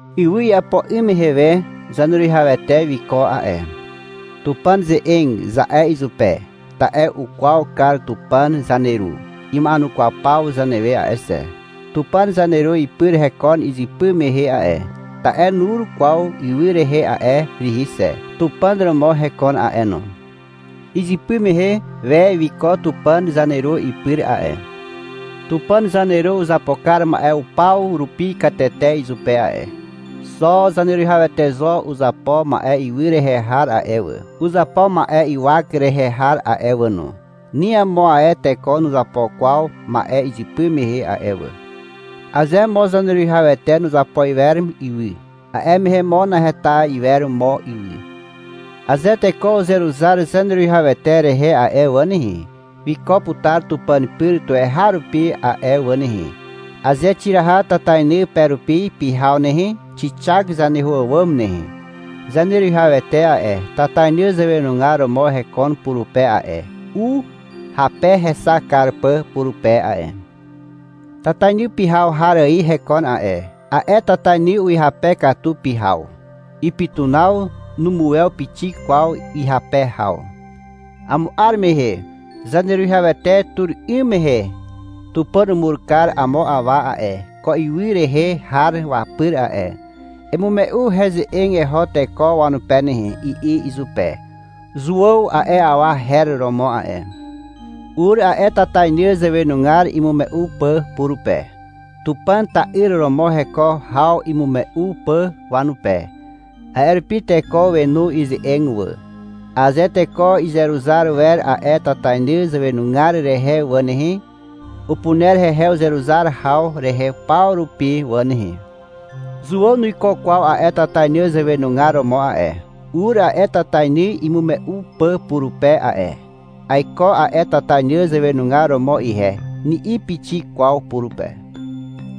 Ywy iapo 'ym mehe we Zaneruwihawete wiko a'e. — Tupàn ze'eg, za'e izupe, ta'e ukwaw kar Tupàn (zaneru) ima'enukwaw paw zanewe a'e xe. Tupàn zaneru ipyr hekon izypy mehe a'e, (ta'e nur kwaw ywy rehe a'e rihi xe). Tupàn romo hekon a'e no. Izypy mehe we wiko Tupàn (zaneru) ipyr a'e. Tupàn (zaneru) uzapo kar ma'e paw rupi katete izupe a'e. Xo Zaneruwihawete zo uzapo ma'e ywy rehe har a'e wà, uzapo ma'e ywak rehe har a'e wà no. Ni amo ae teko nuzapo kwaw ma'e izypy mehe a'e wà. Aze mo Zaneruwihawete nuzapo iwer ywy, a'e mehe mo naheta iwer mo ywy. Aze teko uzeruzar Zaneruwihawete rehe a'e wà nehe, wiko putar Tupàn pyr tuweharupi a'e wà nehe. Aze xiraha tatainy pe rupi pyhaw nehe, xixak zaneho àwàm nehe. Zaneruwihawete a'e, tatainy zàwenugar romo hekon purupe a'e, u hape hexak kar pà purupe a'e. Tatainy pyhaw har ài hekon a'e. A'e tatainy uhyape katu pyhaw. Ipytunaw numuwew pixik kwaw ihyape haw. Amo 'ar mehe (Zaneruwihawete tur 'ym mehe) Tupàn umur kar amo awa a'e, ko ywy rehe har wapyr a'e. — Emume'u heze'eg eho teko wanupe nehe, i'i izupe. Zuàw a'e awa her romo a'e. Ur a'e tatainy zàwenugar imume'u pà purupe, (Tupàn ta'yr romo heko haw imume'u pà wanupe). A'e rupi teko wenu ize'eg wà. Aze teko izeruzar wer a'e tatainy zàwenugar rehe wà nehe, upuner hehe uzeruzar haw rehe paw rupi wà nehe. Zuàw nuiko kwaw a'e tatainy zàwenugar romo a'e. Ur a'e tatainy imume'u pà purupe a'e. (— Aiko a'e tatainy zàwenugar romo ihe, ni'i pixik kwaw purupe.)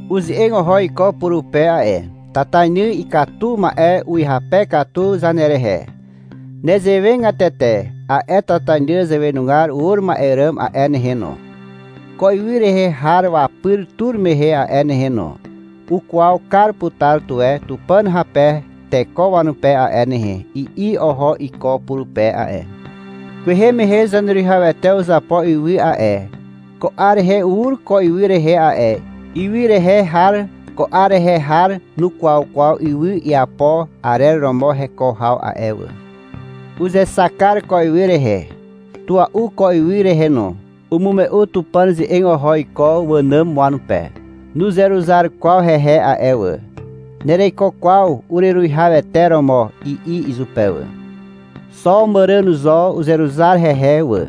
Uze'eg oho iko purupe a'e. — Tatainy ikatu ma'e uhyape katu zanerehe. Nezewegatete a'e tatainy zàwenugar ur ma'e ràm a'e nehe no, ko ywy rehe har wapyr tur mehe a'e nehe no, ukwaw kar putar tuwe Tupàn hape teko wanupe a'e nehe, i'i oho iko purupe a'e. Kwehe mehe Zaneruwihawete uzapo ywy a'e. Ko 'ar rehe ur ko ywy rehe a'e. Ywy rehe har ko 'ar rehe har nukwaw kwaw ywy iapo arer romo heko haw a'e wà. Uzexak kar ko ywy rehe, tua'u ko ywy rehe no. Umume'u Tupàn ze'eg oho iko wànàm wanupe. Nuzeruzar kwaw hehe a'e wà. — Nereiko kwaw ureruwihawete romo, i'i izupe wà. Xo màràn zo uzeruzar hehe wà.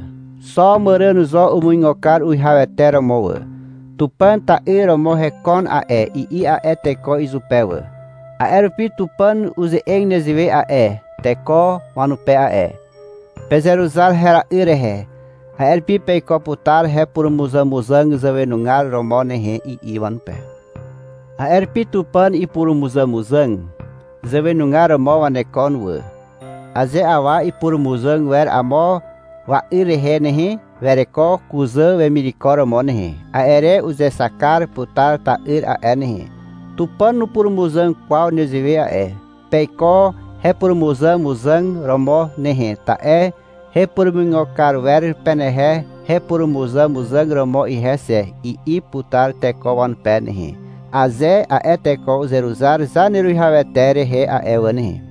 Xo màràn zo umuigo kar uwihawete romo wà. — Tupàn ta'yr romo hekon a'e, i'i a'e teko izupe wà. A'e rupi Tupàn uze'eg nezewe a'e teko wanupe a'e. — Pezeruzar hera'yr rehe, a'e rupi peiko putar hepurumuzàmuzàg zàwenugar romo nehe, i'i wanupe. A'e rupi Tupàn ipurumuzàmuzàg zàwenugar romo wanekon wà. Aze awa ipurumuzàg wer amo wa'yr rehe nehe, wereko kuzà wemireko romo nehe. A'e re uzexak kar putar ta'yr a'e nehe. Tupàn nupurumuzàg kwaw nezewe a'e. — Peiko hepurumuzàmuzàg romo nehe, ta'e hepurumuigo kar wer penehe hepurumuzàmuzàg romo ihe xe, i'i putar teko wanupe nehe, aze a'e teko uzeruzar Zaneruwihawete rehe a'e wà nehe.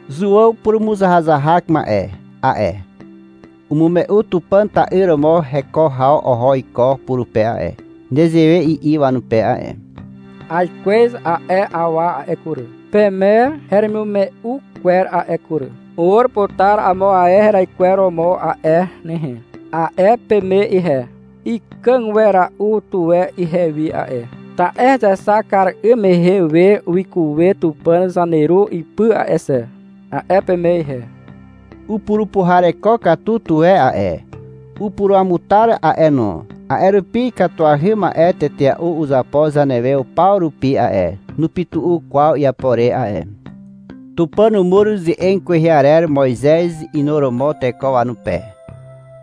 Zuàw (purumuzahazahak ma'e) a'e, umume'u Tupàn ta'yr romo heko haw oho iko purupe a'e. Nezewe i'i wanupe a'e. — Aikwez a'e awa a'e kury, peme heremimume'u kwer a'e kury. — Ur putar amo ae heraikweromo a'e nehe, a'e peme ihe. Ikàg wera'u tuwe ihewi a'e, ta'e hezexak kar 'ym mehe we wikuwe Tupàn zaneru ipyr a'e xe, a'e peme ihe. Upurupuhareko katu tuwe a'e, upuruamutar a'e no, a'e rupi ikatuahy ma'e tetea'u uzapo zanewe paw rupi a'e. Nupytu'u kwaw iapo re a'e. Tupàn umur ze'eg kwehe arer Moizez inuromo teko wanupe.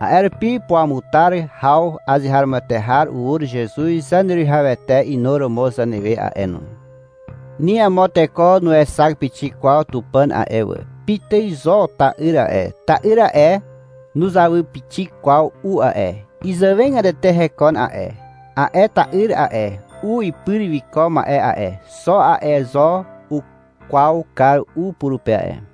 A'e rupi puruamutar haw azeharomoete har ur Zezuz Zaneruwihawete inuromo zanewe a'e no. Ni amo teko nuexak pixik kwaw Tupàn a'e wà. Pitài zo ta'yr a'e. Ta'yr a'e, nuzawy pixik kwaw u a'e. Izàwegatete hekon a'e. A'e ta'yr a'e, u ipyr wiko ma'e a'e, xo a'e zo ukwaw kar u purupe a'e.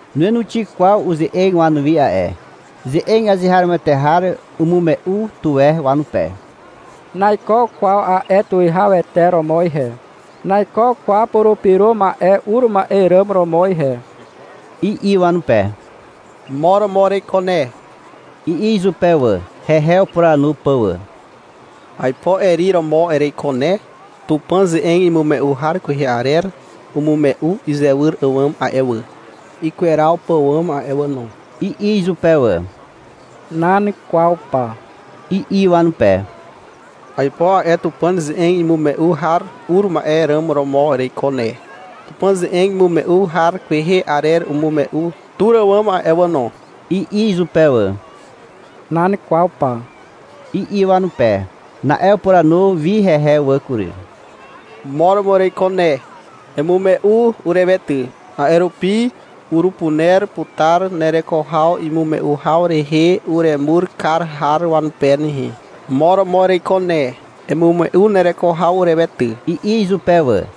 Nuenuxi kwaw uze'eg wanuwi a'e. Ze'eg azeharomoete har umume'u tuwe wanupe. — Naiko kwaw a'e tuwihawete romo ihe, naiko kwaw Purupyro Ma'e ur ma'e ràm romo ihe, i'i wanupe. — Mo romo ereiko ne, i'i izupe wà, hehe upuranu pà wà. — Aipo Eri romo ereiko ne. (Tupàn ze'eg imume'u har kwehe arer umume'u izewyr àwàm a'e wà, ikweraw pàwàm a'e wà no), i'i izupe wà. — Nan kwaw pa, i'i wanupe. — Aipo a'e Tupàn ze'eg imume'u har ur ma'e ràm romo ereiko ne, (Tupàn ze'eg imume'u har kwehe arer umume'u tur àwàm a'e wà no), i'i izupe wà. — Nan kwaw pa, i'i wanupe. Na'e upuranu wi hehe wà kury. — Mo romo ereiko ne. Emume'u urewe ty. A'e rupi urupuner putar nereko haw imume'u haw rehe uremur kar har wanupe nehe. Mo romo ereiko ne, emume'u nereko haw urewe ty, i'i izupe wà.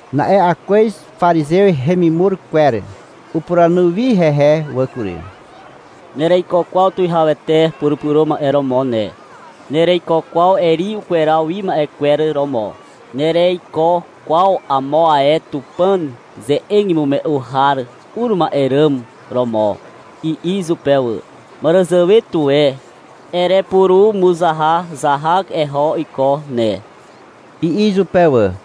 Na'e akwez parizew hemimur kwer upuranu wi hehe wà kury. — Nereiko kwaw Tuwihawete Purupyro Ma'e romo ne. Nereiko kwaw Eri ukweraw wi ma'e kwer romo. Nereiko kwaw amo ae Tupàn ze'eg imume'u har ur ma'e ràm romo, i'i izupe wà. — Màràzàwe tuwe erepurumuzahazahak eho iko ne, i'i izupe wà.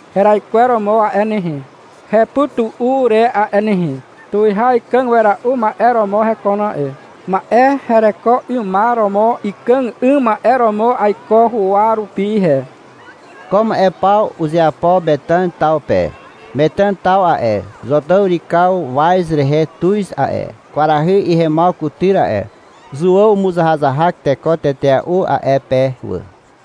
heraikweromo a'e nehe, hepytu'u re a'e nehe. Tuwihaw ikàg wera'u ma'e romo hekon a'e. Ma'e hereko 'ymar romo ikàg 'ym ma'e romo aiko huwa rupi ihe. Ko ma'e paw uzeapo Metàn taw pe. Metàn taw a'e, Zotàw yrykaw waz rehe tuz a'e, kwarahy ihemaw kutyr a'e. Zuàw umuzahazahak teko tetea'u a'e pe wà.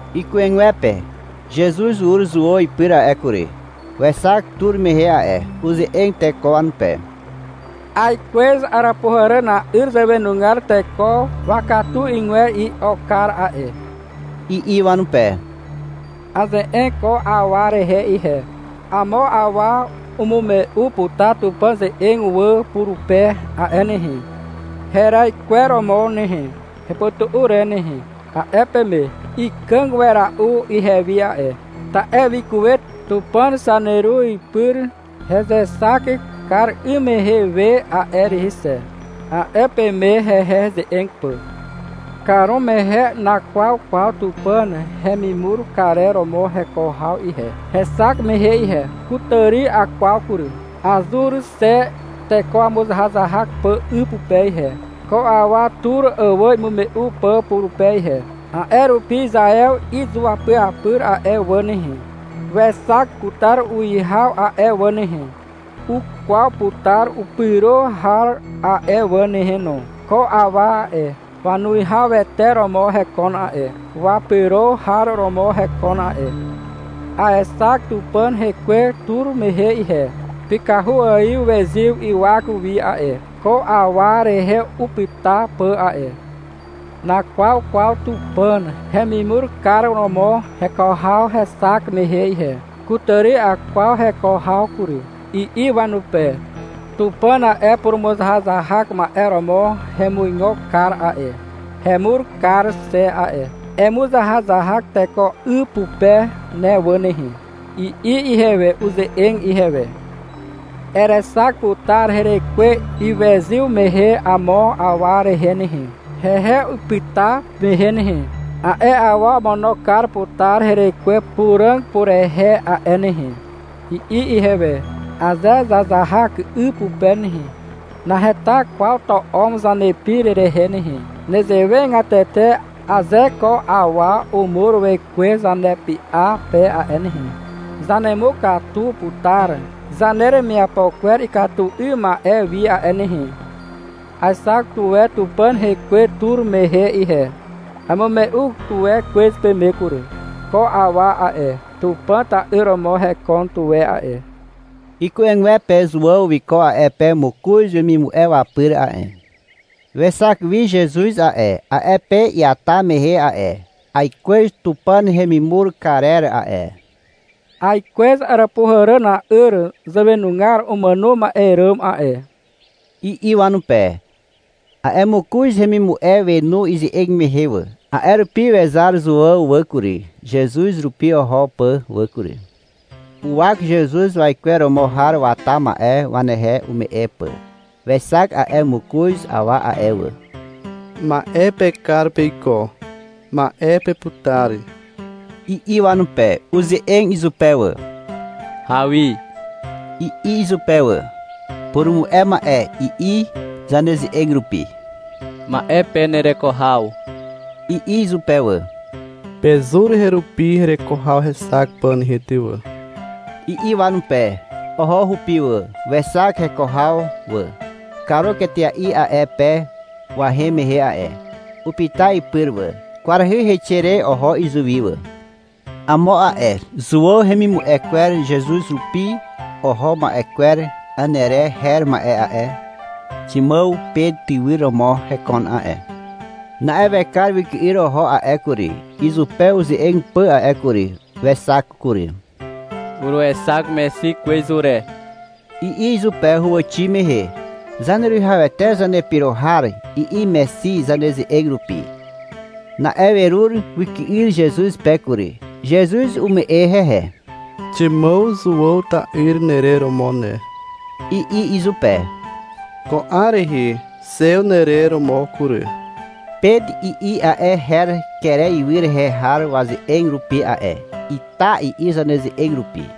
Iku'egwepe Zezuz ur Zuàw ipyr a'e kury. Wexak tur mehe a'e. Uze'eg teko wanupe. — Aikwez àràpuhàràna'yr zàwenugar teko wakatu 'ygwer i'okar a'e, i'i wanupe. Aze'eg ko awa rehe ihe. — Amo awa umume'u putar Tupàn ze'eg wà purupe a'e nehe, heraikweromo nehe, hepytu'u re nehe, a'e peme. — Ikàg wera'u ihewi a'e, ta'e wikuwe Tupàn zaneru ipyr hezexak kar 'ym mehe we a'e rihi xe, a'e peme, hehe heze'eg pà. Karumehe nakwaw kwaw Tupàn hemimur karer romo heko haw ihe, hexak mehe ihe. Kutàri akwaw kury. Azur xe teko wamuzahazahak pà 'y pupe ihe, ko awa tur àwàm imume'u pà purupe ihe. A'e rupi Izaew izuapyapyr a'e wà nehe, wexak putar uwihaw a'e wà nehe, ukwaw putar upyro har a'e wà nehe no. Ko awa a'e, wanuwihawete romo hekon a'e, wapyro har romo hekon a'e. Aexak Tupàn rekwe tur mehe ihe. Pykahu ài wezyw ywak wi a'e, ko awa rehe upyta pà a'e. Nakwaw kwaw Tupàn hemimur kar romo heko haw hexak mehe ihe. Kutàri akwaw heko haw kury, i'i wanupe. Tupàn a'e, purumuzahazahak ma'e romo hemuigo kar a'e, hemur kar xe a'e. — Emuzahazahak teko 'y pupe ne wà nehe, i'i ihewe. Uze'eg ihewe. — Erexak putar herekwe iwezyw mehe amo awa rehe nehe, hehe ipyta mehe nehe. A'e awa omono kar putar herekwe Puràg purehe a'e nehe, i'i ihewe. (Aze zazahak 'y pupe nehe, naheta kwaw to'om zanepir rehe nehe. Nezewegatete, aze ko awa umur wekwe zanepy'a pe a'e nehe, zanemukatu putar zaneremiapo kwer ikatu 'ym ma'e wi a'e nehe.) Aexak tuwe Tupàn rekwe tur mehe ihe. Amume'u tuwe kwez peme kury. Ko awa a'e, Tupàn ta'yr romo hekon tuwe a'e. Iku'egwepe Zuàw wiko a'e pe mokoz wemimu'e wapyr a'e. Wexak wi Zezuz a'e, a'e pe iata mehe a'e. — Aikwez Tupàn hemimur karer a'e, aikwez àràpuhàràna'yr zàwenugar umàno ma'e ràm a'e, i'i wanupe. A'e mokoz hemimu'e wenu ize'eg mehe wà. A'e rupi wezar Zuàw wà kury, Zezuz rupi oho pà wà kury. Uwak Zezuz waikweromo har wata ma'e wanehe ume'e pà. Wexak a'e mokoz awa a'e wà. — Ma'e pekar peiko, ma'e peputar, i'i wanupe. Uze'eg izupe wà. — Hawi, i'i izupe wà. (— Purumu'e ma'e, i'i zaneze'eg rupi.) — Ma'e pe nereko haw, i'i izupe wà. — Pezur herupi hereko haw hexak pà nehe ty wà, i'i wanupe. Oho hupi wà. Wexak heko haw wà. Karuk etea'i a'e pe wahem mehe a'e. Upyta ipyr wà. Kwarahy heixe re oho izuwi wà. Amo a'e Zuàw hemimu'e kwer Zezuz rupi oho ma'e kwer Anere her ma'e a'e, Ximàw Pet tywyr romo hekon a'e. Na'e wekar wyky'yr oho a'e kury, izupe uze'eg pà a'e kury. Wexak kury. — Uruexak Mexi kwez ure, i'i izupe huwàxi mehe. (— Zaneruwihawete Zanepyro har, i'i Mexi zaneze'eg rupi.) Na'e werur wyky'yr Zezuz pe kury. Zezuz ume'e hehe. — Ximàw Zuàw ta'yr nerer romo ne, i'i izupe. — Ko 'ar rehe Xew nerer romo kury. (— Pet, i'i a'e her kere ywy rehe har waze'eg rupi a'e. — Ita, i'i zaneze'eg rupi.)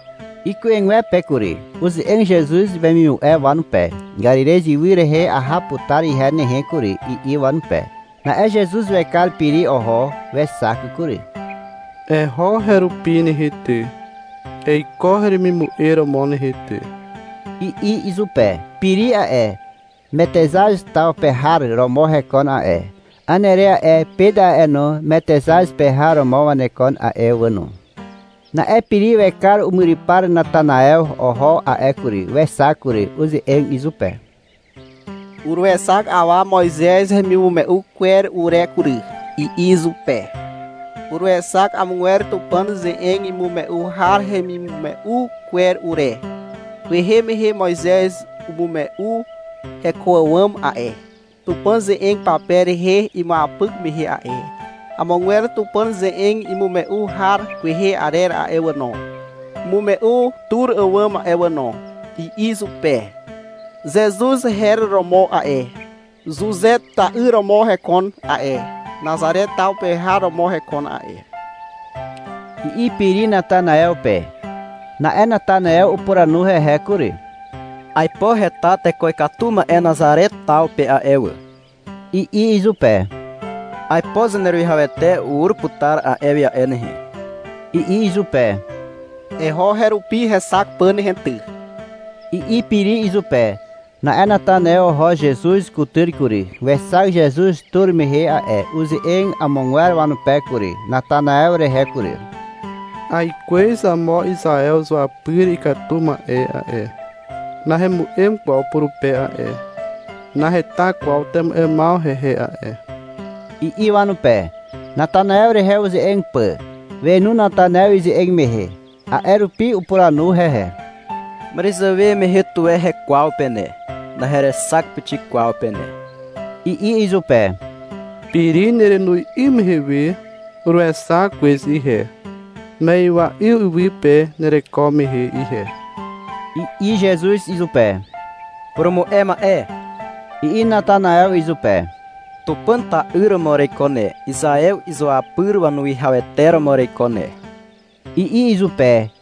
Iku'egwepe kury. Uze'eg Zezuz wemimu'e wanupe. — Karirez ywy rehe aha putar ihe nehe kury, i'i wanupe. Na'e Zezuz wekar Piri oho. Wexak kury. — Eho herupi nehe ty, eiko heremimu'e romo nehe ty, i'i izupe. Piri a'e, Metexaz taw pe har romo hekon a'e. Anere a'e, Pet a'e no, Metexaz pe har romo wanekon a'e wà no. Na'e Piri wekar umyrypar Natanaew oho a'e kury, wexak kury. Uze'eg izupe. — Uruexak awa Moizez hemimume'u kwer ure kury, i'i izupe. Uruexak amogwer Tupàn ze'eg imume'u har hemimume'u kwer ure. — Kwehe mehe Moizez umume'u heko àwàm a'e, Tupàn ze'eg pape rehe imuapyk mehe a'e. Amogwer Tupàn ze'eg imume'u har kwehe arer a'e wà no, umume'u tur àwàm a'e wà no, i'i izupe. — Zezuz her romo a'e, Zuze ta'yr romo hekon a'e, Nazare taw pe har romo hekon a'e, i'i Piri Natanaew pe. Na'e Natanaew upuranu hehe kury. — Aipo heta teko ikatu ma'e Nazare taw pe a'e wà, i'i izupe. — Aipo Zaneruwihawete ur putar a'e wi a'e nehe, i'i izupe. — Eho herupi hexak pà nehe ty, i'i Piri izupe. Na'e Natanaew oho Zezuz kutyr kury. Wexak Zezuz tur mehe a'e. Uze'eg amogwer wanupe kury, Natanaew rehe kury. — Aikwez amo Izaew izuapyr ikatu ma'e a'e. Nahemu'em kwaw purupe a'e. Naheta kwaw temu'emaw hehe a'e, i'i wanupe, Natanaew rehe uze'eg pà. Wenu Natanaew ize'eg mehe. A'e rupi upuranu hehe. — Màràzàwe mehe tuwe hekwaw pe ne. Naherexak pixik kwaw pe ne, i'i izupe. — Piri nerenoz 'ym mehe uruexak kwez ihe, ma'ywa'yw iwy pe nereko mehe ihe, i'i Zezuz izupe. — Purumu'e ma'e, i'i Natanaew izupe. — Tupàn ta'yr romo ereiko ne, Izaew izuapyr wanuwihawete romo ereiko ne, i'i izupe.